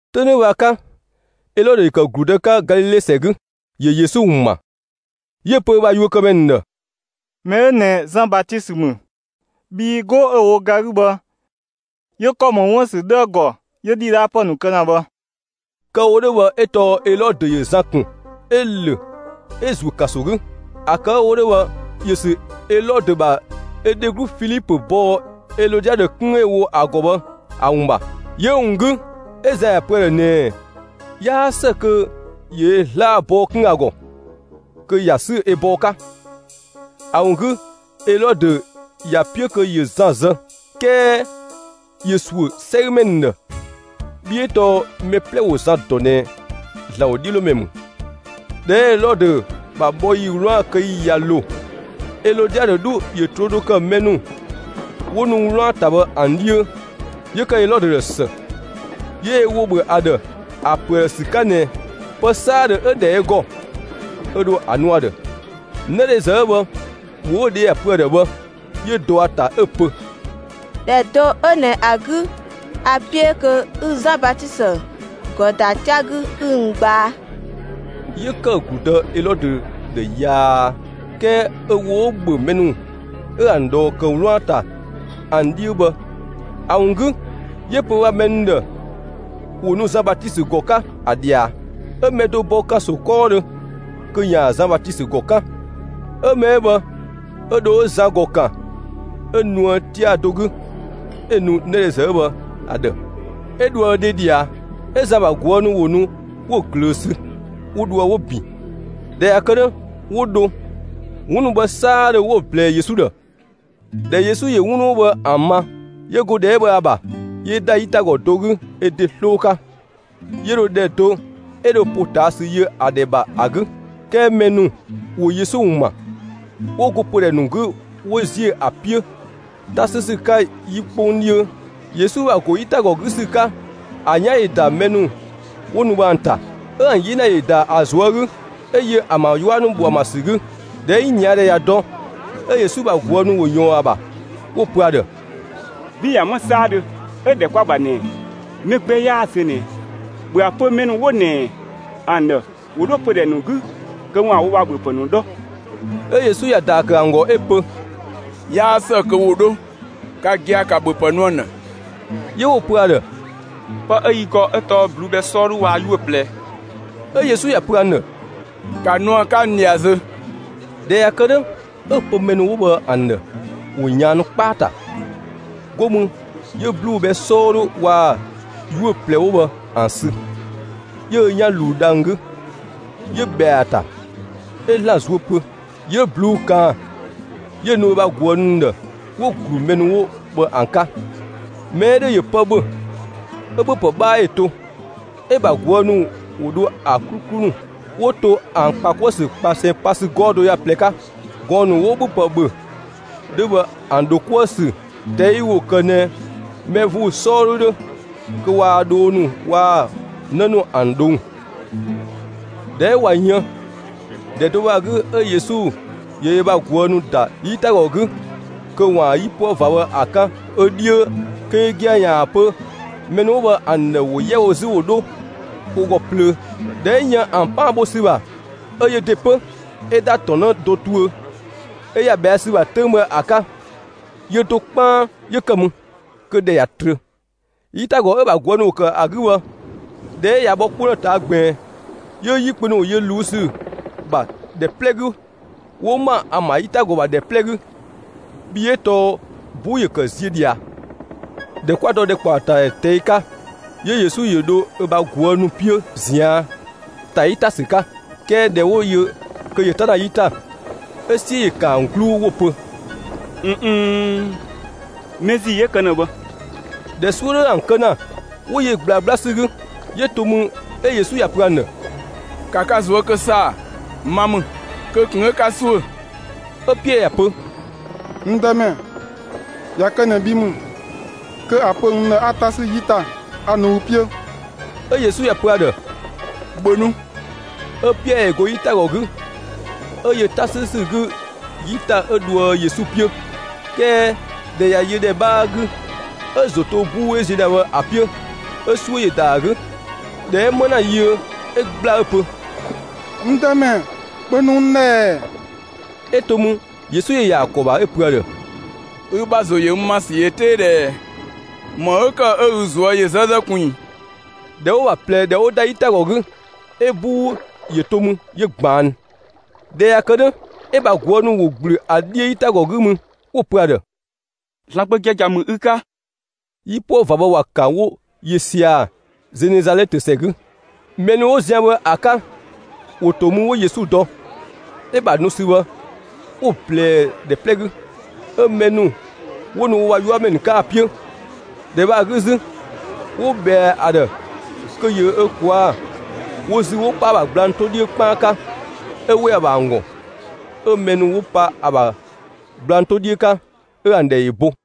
'Töng 'dhö bhë ‑a 'ka, Elɔdö ‑yö ‑kë ‑gludë 'ka Galile ‑sɛ 'gü, ‑yö Yesu ‑wun ‑ma. 'Yö‑ pö ö bha yuökëmɛ ‑nu ‑dhë: «Mɛ 'ö ꞊nɛ Zan Batisö ‑mü, bhii 'go 'ö‑ wo ga 'gü bhë, 'yö ‑kɔ ‑mɔ 'wun ‑bha ‑sü 'dhö ‑a ‑gɔ 'yö ‑dhidhaapë ‑nu kë ‑na bhë.» Kë‑ wo 'dhö bhë 'ö tɔɔ Elɔdö ‑yö Zan ‑kun, 'ö‑ ‑lö 'ö‑ ‑zuö ‑kanso 'gü. ‑A kë 'ö‑ wo 'dhö bhë ‑yö ‑sü Elɔdö ‑bha ö dheglu Filipö bɔɔ Elɔdiadö 'kun 'ö‑ wo ‑a ‑gɔ bhë ‑a ‑wun ‑bha. 'Yö‑ ‑wun 'gü, 'ö Zan ‑ya pö ‑a ‑dhë ꞊nɛɛ 'yaa ‑së kö ‑yö ö 'zlaa‑ bɔɔ 'kun ‑a ‑gɔ kö ‑ya 'sü ö bɔɔ 'ka. ‑A ‑wun 'gü Elɔdö ‑ya 'piö kö ‑yö Zan zë, 'kɛɛ ‑yö ‑suö 'sɛgümɛ ‑nu ‑dhë, bhii 'ö tɔɔ mɛ 'plɛ ‑wo Zan ‑dɔ ꞊nɛ ‑Zlan ‑wodhiölomɛ ‑mü. ꞊Dhɛ 'ö Elɔdö ‑bha bhɔ ‑yi 'wlaan‑ kë ‑yi ꞊ya ‑lo, Elɔdiadö 'dhu ‑yö ꞊troo' do kë mɛ ‑nu 'wo nu 'wlaan‑ ‑ta bhë ‑an 'dhiö, 'yö ‑kë Elɔdö ‑dhë ‑së. 'Yö ö ‑wo ‑bhö ‑a ‑dhë ‑a pö ‑a ‑dhë ‑sü 'ka ꞊nɛ pë 'saadhö 'ö‑ ‑dhɛ ö ‑gɔ, 'ö dho ‑a nu ‑a ‑dhë. 'Nëdhezë 'ö bhë, ‑wo 'ö‑ dhe ‑ya pö ‑a ‑dhë bhë, 'yö dɔ ‑a ‑ta 'ö‑ pö: «‑Dhɛ do 'ö ꞊nɛ ‑a 'gü, a‑ 'piö kö 'ü Zan Batisö ‑gɔ ‑da 'tia‑ 'gü 'ü n gbaa.» 'Yö ‑kë ‑gludë Elɔdö ‑dhë yaa; 'kɛɛ ö ‑wo 'ö‑ ‑bhö mɛ ‑nu 'ö ‑an ꞊dhɔɔ ‑kë 'wlaan‑ ‑ta ‑an 'dhiö bhë ‑a ‑wun 'gü, 'yö‑ pö ö ‑bha mɛ ‑nu ‑dhë ‑wo nu Zan Batisö ‑gɔ 'ka ‑a ꞊dhia. 'Ö mɛ do bɔ ‑kanso 'kɔɔdhö kö ‑yaan Zan Batisö ‑gɔ 'kan. 'Ö mɛ 'ö bhë 'ö dho 'ö Zan ‑gɔ 'kan 'ö nuë 'tia‑ do 'gü 'ö‑ nu 'nëdhezë 'ö bhë ‑a ‑dhë, 'ö dhoë ö dhe ꞊dhia. 'Ö Zan ‑bha ꞊guë' ‑nu ‑wo nu 'wo‑ ꞊glöö sü, 'wo dhoë 'wo‑ ‑bin. ꞊Dhɛ ꞊ya kë 'dhö, 'wo dho, 'wun ‑nu bhë 'saadhö 'wo‑ ꞊blɛɛ Yesu ‑dhë. ꞊Dhɛ Yesu ‑yö 'wun ‑nu 'wo bhë ‑an ma, 'yö go ‑dhɛ 'ö bhë ‑a ‑bha, 'yö ‑da 'yitagɔ do 'gü ö ‑de 'sloo 'ka, 'yö dho ‑dhɛ do 'ö dho ‑potaasü yö ‑a ‑dhɛ ‑bha ‑a 'gü. 'Kɛɛ mɛ ‑nu ‑wo Yesu ‑wun ‑ma, 'wo go pödhɛ ‑nu 'gü 'wo ‑ziö ‑a 'piö 'ta 'sü ‑sü 'ka 'yi 'kpong 'dhiö. Yesu ‑bha ‑go 'yitagɔ 'gü ‑sü 'ka, ‑a 'yan ‑yö ‑da mɛ ‑nu 'wo nu bhë ‑an ‑ta, 'ö ‑an 'yena ‑yö ‑da ‑a ꞊zuö' 'gü, 'ö yö ‑an ‑bha 'yua ‑nu bo ‑an ‑bha ‑sü 'gü. ꞊Dhɛ 'ö 'yinia ‑dhɛ ꞊ya dɔ, 'ö Yesu ‑bha ꞊guë' ‑nu ‑wo ꞊yɔɔn ‑a ‑bha, 'wo‑ pö ‑a ‑dhë: «'Bin ꞊ya 'më 'saadhö, 'ö ‑dhɛ 'kwa‑ ‑bha ꞊nɛ mɛ gbɛ 'yaa zö ꞊nɛ, ‑bhö ‑a pö mɛ ‑nu 'wo ꞊nɛ ‑an ‑dhë ‑wo 'dho pödhɛ ‑nu 'gü kö ‑waan wo ‑bhöpë ‑nu 'dhɔ!» 'Ö Yesu ‑ya ‑daa ‑kë ‑an ‑gɔ 'ö‑ pö: «'Yaa ‑së kö ‑wo 'dho; ka gia‑, ‑ka ‑bhöpë nu ‑an ‑dhë!» 'Yö 'wo‑ pö ‑a ‑dhë: «Pë 'ö yi ‑gɔ zö 'ö tɔɔ ꞊bluu'‑ bhɛ 'sɔɔdhu waa‑ 'yuö‑ ꞊plɛ!» 'Ö Yesu ‑ya pö ‑an ‑dhë: «‑Ka nu ‑an 'ka n ꞊dhia zö!» ꞊Dhɛ ꞊ya kë 'dhö, 'ö‑ pö mɛ ‑nu 'wo bhë ‑an ‑dhë ‑wo ꞊yaannu 'kpaa‑ ‑ta. 'Go mü 'yö ꞊bluu'‑ bhɛ 'sɔɔdhu waa‑ 'yuö‑ ꞊plɛ 'wo bhë ‑an sü, 'yö ö 'yan ꞊luu dhang‑ 'gü, 'yö ꞊bhɛa ‑a ‑ta; 'ö ‑Zlan zuö pö. 'Yö ꞊bluu'‑ ꞊kaan, 'yö‑ nu ö ‑bha ꞊guë' ‑nu ‑dhë. 'Wo‑ ‑glu mɛ ‑nu 'wo bhë ‑an 'ka. Mɛ 'ö ‑dhö ‑yö pë ‑bhö, 'ö ‑bhöpë 'bhaa ‑yö to. 'Ö‑ ‑bha ꞊guë' ‑nu ‑wo dho ‑a 'kluklu ‑nu 'wo to 'wo‑ ‑kpa 'kuë‑ ‑sü ꞊kpasɛn pa ‑sü 'gɔɔ‑ do ö ga ꞊plɛ 'ka. Gɔɔn‑ ‑nu 'wo ‑bhöpë ‑bhö 'dhö bhë ‑an ‑dho 'kuë‑ ‑sü ꞊tɛi' ‑wo ‑kë ꞊nɛ mɛ ‑vuu 'sɔɔdhu 'dhö kö waa dhoo ‑nu waa‑ 'në ‑nu ‑an ꞊dhong'. ꞊Dhɛ 'ö ꞊wa yën, ‑dhɛ do bhë ‑a 'gü 'ö Yesu ‑yö ö bha ꞊guë' ‑nu ‑da 'yitagɔ 'gü kö ‑waan 'yipuë ꞊va bhë ‑a 'kan ö 'dhiö, kö yö gia‑ ‑yaan ‑a pö mɛ ‑nu 'wo bhë ‑an ‑dhë ‑wo 'yɛ wo 'zü ‑wo 'dho wo ‑gɔ plöö. ꞊Dhɛ 'ö yën ‑an 'paan bho ‑sü ‑bha, 'ö yö ‑de 'pö, 'ö ‑da ‑tɔn 'në do tuö, 'yö ‑ya ꞊bhɛa' ‑sü ‑bha 'töng bhë ‑a 'ka. Yö do 'kpaan 'yö ‑kë mü, kö ‑dhɛ ꞊ya trö. 'Yitagɔ 'ö‑ ‑bha ꞊guë' ‑nu ‑wo ‑kë ‑a 'gü bhë, ꞊dhɛ 'ö ꞊ya bhɔ 'kpong ‑dhë ꞊taa' ꞊gbiin, 'yö 'yi kpö ‑nu ‑wo yö ꞊luu' ‑sü ‑bha ‑dhɛ 'plɛ 'gü 'wo ‑ma ‑an ‑bha 'yitagɔ ‑bha ‑dhɛ 'plɛ 'gü, bhii 'ö tɔɔ 'buu ‑yö ‑kë ziö ꞊dhia. ꞊Dhɛ 'kwa dɔ ‑dhɛkpaɔtadhɛ ꞊tɛi' 'ka, 'yö Yesu ‑yö ‑dho ö bha ꞊guë' ‑nu 'piö ꞊zian', ‑ta 'yi ‑ta ‑sü 'ka. 'Kɛɛ ꞊dhɛ 'wo‑ yö kö ‑yö 'ta ‑na 'yi ‑ta, 'ö 'siö ‑yö ‑kan ‑an 'gluu 'wo‑ pö: «꞊N nn, mɛ ‑zii 'ö kë ‑na bhë!» ꞊Dhɛ 'suö 'dhö ‑an kë ‑na, 'wo yö ꞊gblaa 'gbla ‑sü 'gü. 'Yö to mü, 'ö Yesu ‑ya pö ‑an ‑dhë: «‑Ka ka ꞊zuö' kë ‑saa, ma ‑mü, kö ꞊kun 'ö 'ka ‑suö!» 'Ö Piɛɛ ‑ya pö: «N Dëmɛ, ꞊ya kë ꞊nɛ bhi ‑mü, kö ‑a pö n ‑dhë 'a 'ta 'sü 'yi ‑ta, 'a nu ü 'piö!» 'Ö Yesu ‑ya pö ‑a ‑dhë: «‑Bhö nu!» 'Ö Piɛɛ ‑yö go 'yitagɔ 'gü, 'ö yö 'ta 'sü ‑sü 'gü 'yi ‑ta 'ö dhoë Yesu 'piö. 'Kɛɛ ꞊dhɛ ꞊ya yö ‑dhɛ 'bhaa 'gü, 'ö‑ ‑zo ‑to 'buu 'ö ziö ‑na bhë ‑a 'piö, 'ö 'suö ‑yö ‑da ‑a 'gü. ꞊Dhɛ 'ö 'më ‑na yiö, 'ö ‑gbla 'ö‑ pö: «N Dëmɛ, ‑bhö nu n ‑dhë ‑ɛ!» 'Ö to mü, Yesu ‑yö ‑ya ‑a ‑kɔ ‑bha, 'ö‑ pö ‑a ‑dhë: «Ü ‑bha ‑zo yö ‑sü ‑yö 'tee ꞊dhɛɛ! ‑Më 'ö ‑kë 'ö ü ꞊zuö' ‑yö 'zëzë ꞊kun ꞊i?» ꞊Dhɛ 'wo‑ ‑bha ꞊plɛ ꞊dhɛ 'wo ‑da 'yitagɔ 'gü, 'ö 'buu ‑yö to mü 'yö ꞊gbaannu. ꞊Dhɛ ꞊ya kë 'dhö, 'ö‑ ‑bha ꞊guë' ‑nu ‑wo ‑gblü ‑a 'dhiö 'yitagɔ 'gü mü, 'wo‑ pö ‑a ‑dhë: «‑Zlan Gbö giagia ‑mü ü 'ka!» 'Yipuë ꞊va bhë ‑wa ‑kan 'wo yö sia‑ Zenezalɛtö ‑sɛ 'gü. Mɛ ‑nu 'wo zian bhë ‑a 'ka, ‑wo ‑to mü, 'wo Yesu dɔ. 'Ö‑ ‑bha nu ‑sü bhë, 'wo‑ ꞊blɛɛ ‑dhɛ 'plɛ 'gü; 'ö mɛ ‑nu 'wo nu wo ‑bha 'yuamɛ ‑nu 'ka‑ 'piö. ‑Dhɛ bhë ‑a 'gü 'zü, 'wo ꞊bhɛa ‑a ‑dhë kö ‑yö ö ꞊kwaa' wo ‑zü 'wo 'pa ‑a ‑bha gblang 'to 'dhiö 'kpaan 'ka; ('ö ‑we ‑a ‑bha ‑an ‑gɔ,) 'ö mɛ ‑nu 'wo pa ‑a ‑bha gblang 'to 'dhiö 'ka, 'ö ‑an ‑dhɛ ‑yö bo.